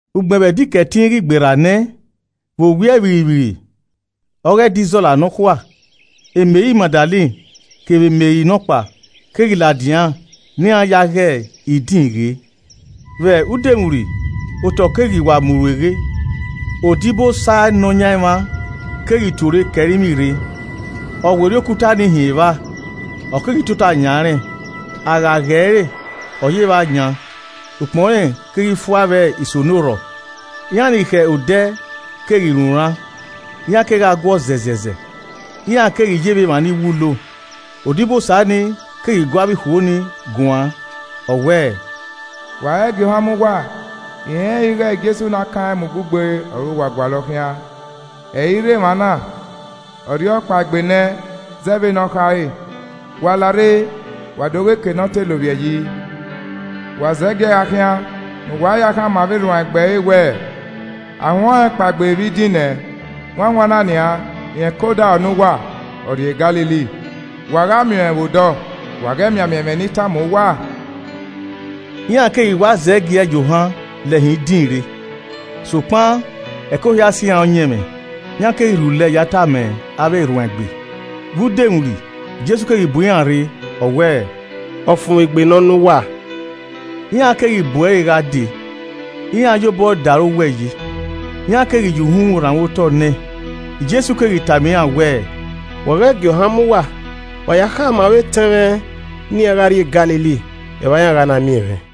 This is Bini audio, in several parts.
Ugbẹn vbe Ẹdẹ Ikẹtin ghi gberra nẹ, vbe owiẹ vbirrivbirri ọghe ẹdẹ Izọla nọkhua, Meri Magdalen kevbe Meri nọkpa keghi ladian ne iran ya ghe idin ghe. Vbe udomwurri, otọ keghi wa mu rueghe, odibosa Nọyaẹnmwa keghi tuorre ke ẹrinmwi rre, ọ werriẹ okuta ni hin evba, ọ keghi tota yan rẹn. A gha ghe ẹre, ọ yevbe ayan, ukpọn rẹn keghi fua vbe isonorhọ. Iran ni khẹ odẹ keghi runran, iran kegha guọ zẹzẹzẹ, iran keghi ye vbe emwa ni wulo. Odibosa nii keghi gu avbe ikhuo ni guan, ọ wẹẹ, “Wa ghẹ gie ohan mu uwa, I rẹnrẹn ighẹ Jesu ne a kan ẹn mu ugbugbe ọre uwa gualọ khian. Ẹ i ghi rre emwa na, ọ rhiọkpaegbe nẹ zẹ vbene ọ khare. Wa larre, wa do ghe eke ne ọ te lovbiẹ yi. Wa zẹgiẹ gha khian, ne uwa ya khama avbe erhuanegbe ẹre wẹẹ, ‘A huẹn ọnrẹn kpaegbe vbe idin nẹ, wanwanna nian, rẹn ke odaro ne uwa, ọ rrie Galili, wa gha miẹn ọẹn vbe odọ.’ Wa ghẹ mianmian ẹmwẹ ne I tama uwa.” Iran keghi wa zẹgiẹ ya ohan lẹ hin idin rre, sokpan ẹko hia sẹ iran ọyẹnmwẹ, iran keghi rhulẹ ya tama avbe erhuanegbe. Vbe udomwurri, Jesu keghi bu iran rre, ọ wẹẹ, “Ọfumwegbe nọ ne uwa.” Iran keghi bu ẹre gha dee, iran ye obọ da ẹre owẹ yi, iran keghi ya uhunmwu rhanmwẹ otọ ne ẹn. Jesu keghi tama iran wẹẹ, “Wa ghẹ gie ohan mu uwa, wa ya khama avbe etẹn mwẹ ne iran gha rrie Galili, evba iran gha na miẹn mwẹ.”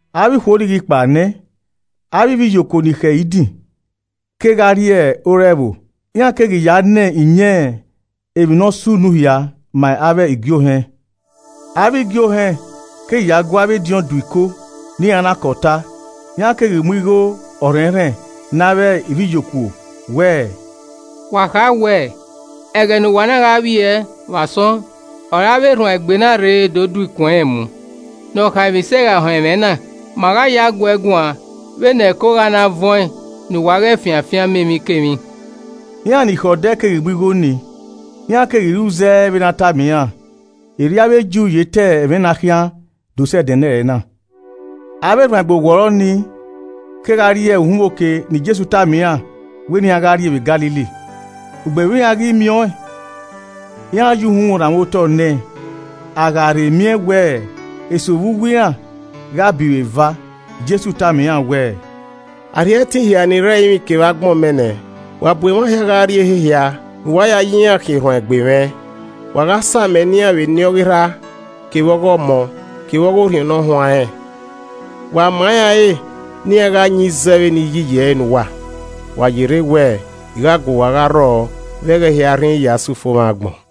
Avbe ikhuo ni ghi kpao nẹ, avbe ivbiyokuo ni khẹ idin kegha rrie ore ẹvbo, iran keghi ya na iyẹn emwi ne ọ sunu hia ma avbe igie ohẹn. Avbe igie ohẹn keghi ya gu avbe ediọn do iko ne iran na ke ọta, iran keghi mu igho ọrhẹnrhẹn ne avbe ivbiyokuo wẹẹ, “Wa kha wẹẹ ẹghẹ ne uwa na gha vbiẹ vbe asọn ọre avbe erhuanegbe na rre do do ikun ẹnrẹn mu. Nọkhaemwisẹ gha họn ẹmwẹ na, ma gha ya guee guan vbene ẹko gha na vuọn ne uwa ghẹ fian afianma emwikemwi.” Iran ni khẹ odẹ keghi mu igho ni, iran keghi ru zẹ vbene a tama iran. Erriọ avbe Ju ye ta ẹmwẹ na khian do sẹ ẹdẹnẹrẹ na. Avbe erhuanegbe owọrọ ni kegha rrie uhunmwu oke ne Jesu tama iran wẹ ne iran gha rrie vbe Galili. Ugbẹn vbe iran ghi miẹn ọẹn, iran ya uhunmwu rhanmwẹ otọ ne ẹn a gha rhe miẹn wẹẹ eso vbe uwu iran gha a biro eva. Jesu tama iran wẹẹ, “A rhie ẹtin hia ni rre ẹrinmwi kevbe agbọn mẹ nẹ. Wa bu emwa hia gha rrie ehe hia ne uwa ya gha ya iran khian erhuanegbe mwẹ, wa gha samẹ ne iran vbe Eni ọghe Erha, kevbe Ọmọ kevbe ọghe Orhiọn Ne Ọ Huanrẹn. Wa ma iran ẹre ne iran gha yin zẹ vbene I yi ẹre iyi ne uwa. Wa yerre wẹ I gha gu uwa gha rrọọ vbe ẹghẹ hia rhinrin ya sẹ ufomwẹ agbọn.”